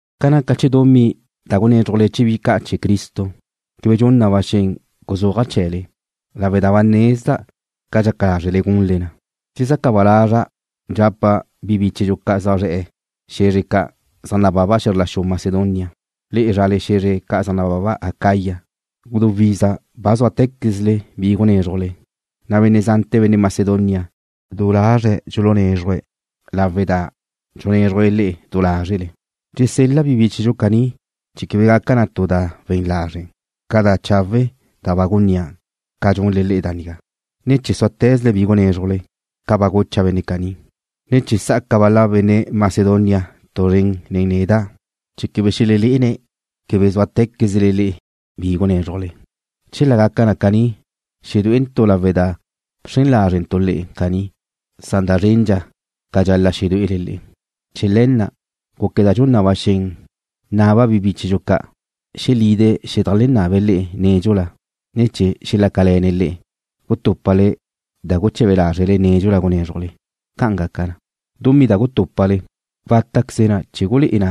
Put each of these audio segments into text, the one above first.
Ca naca chee̱ dumí da gunézrujle chee̱ bi ca' chee̱ Cristo, quebe dxun na ba xen guzúaja' chee̱le, lawe' da ba nezda' ca dxaca lázrele gunle na. Dxezaca ba lazra' dxapa' bi bíchedxu zaj zre̱'e̱ xe̱zre ca' zaj nababa xe̱zr la xu Macedonia, le'e zrale xe̱zre ca' zaj nababa Acaya, gudú iza ba zúate̱quezle bi gunézrujle, na' benne' zante̱ benne' Macedonia du lazre̱' dxulunézruje̱' lawe' da dxunézrujle le'e du lázrele. Dxusel-la' bi bíchedxu caní chee̱ quebe gaca tu da we̱n lazre' ca da chawe' da ba gunnía' ca dxunle le'e da nigá, ne chee̱ súate̱zle bi gunézrujle, ca ba gucha' benne' caní, ne che sa'aca bal-la benne' Macedonia tu zren nen neda' chee̱ quebe xelelé'ene̱' quebe zúate̱quezle le'e bi gunézrujle. Chela gaca na caní xedué'entu' lawe' da bxren lázrentu' le'e caní, na' da zrendxa ca dxal-la' xedué'ele le'e. Chee̱ le̱ na' gúqueda' dxun na ba xen naba' bi bíchedxu ca' xelide̱' xedajlennabe̱' le'e nédxula, ne chee̱ xelácale̱ne̱' le'e gutúpale da guche̱be lázrele nédxula gunézrujle. Ca' gaca na, dumí da gutúpale watá'queze na chee̱ gulé'e na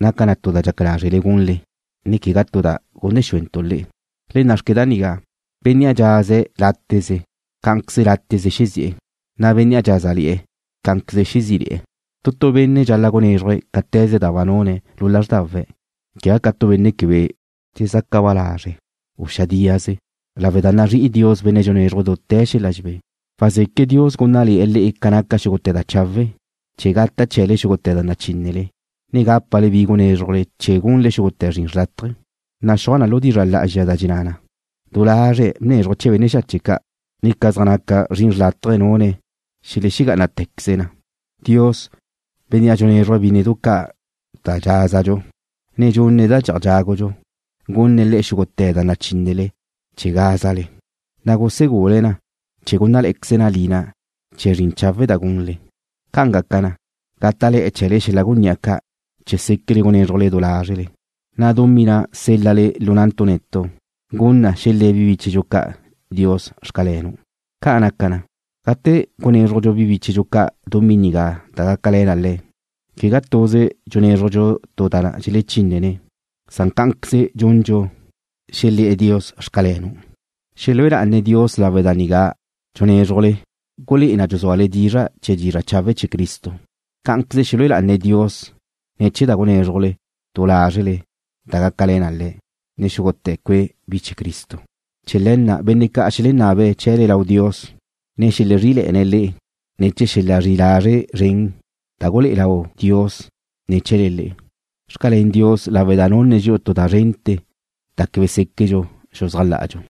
naca tu da dxaca lázrele gunle, ne quegá tu da gunne xúentu' le'e. Le nna'xque da nigá: Bénnea' dxaze̱' láteze, cá'anqueze láteze xezi'e̱, na' bénnea' dxázale̱'e̱, cá'anqueze xezí'ile̱'e̱. Tu tu benne' dxal-la' gunézruje̱' cáte̱ze da ba nune̱' lu lázrdawe̱', quegá ca tu benne' quebe dxezaca ba lazre', u xadíaze, lawe' da nazrí'i Dios benne' dxunézruje̱' dute̱ xel-la dxebé. Wazeque' Dios gúnnale̱'e̱ le'e ca naca xúgute̱ da chawe', chee̱ gata' chee̱le xúgute̱ da nachínele, ne gápale bi gunézrujle chee̱ gunle xúgute̱ zrin xrlátaje. Naxúaj lu dizra' lá'azxa da dxenná na: Du lazre̱' bnézruje̱' chee̱ benne' xache' ca'. Ca zaj naca zrin xrlátaje nune̱' xelegá'anatequeze na. Dios, Bénnea' dxunézruje̱' bínnedu ca' da dxázadxu, ne dxunne̱' da dxi'aj dxágudxu, gunne̱' le'e xúgute̱ da nachínele chee̱ gázale, na' gusegule̱' na chee̱ gúnnale̱'e̱queze na lina chee̱ zrin chawe' da gunle. Ca' gaca na, gáta'le̱'e̱ chee̱le xel-la gunní'a ca' chee̱ séquele gunézrujle du lázrele, na' dumí na' sél-lale lu na'ntu' netu' gun na xelé̱ bi bíchedxu ca' Dios: Xcalenu'. Ca' naca na, gate gunézrujdxu bi bíchedxu ca' dumí nigá da gácale̱ na le̱', quegá tuze dxunézrujdxu tu da dxelechínnene̱' san cá'anqueze dxundxu xelé̱'e̱ Dios: Xcalenu'. Xelúe lá'ane̱' Dios lawe' da da nigá dxunézrujle gulé'e na dxuzúale dizra' chee̱ dizra' chawe' chee̱ Cristo. Cá'anqueze xelúe lá'ane̱' Dios ne̱ chee̱ da gunézrujle du lázrele da gácale̱ na le̱', ne xúgute̱ cue' bi chee̱ Cristo. Chee̱ le̱ na' benne' ca' xelenabe̱' chee̱le lau Dios, ne xelezrí'ile̱'e̱ne̱' le'e ne̱ chee̱ xel-la zri'i lazre' zren da gulé'e lau Dios ne̱ chee̱le le'e. Xcalén Dios lawe' da nunne̱' dxi'u tu da zrente̱ da quebe séquedxu xuzájla'adxu.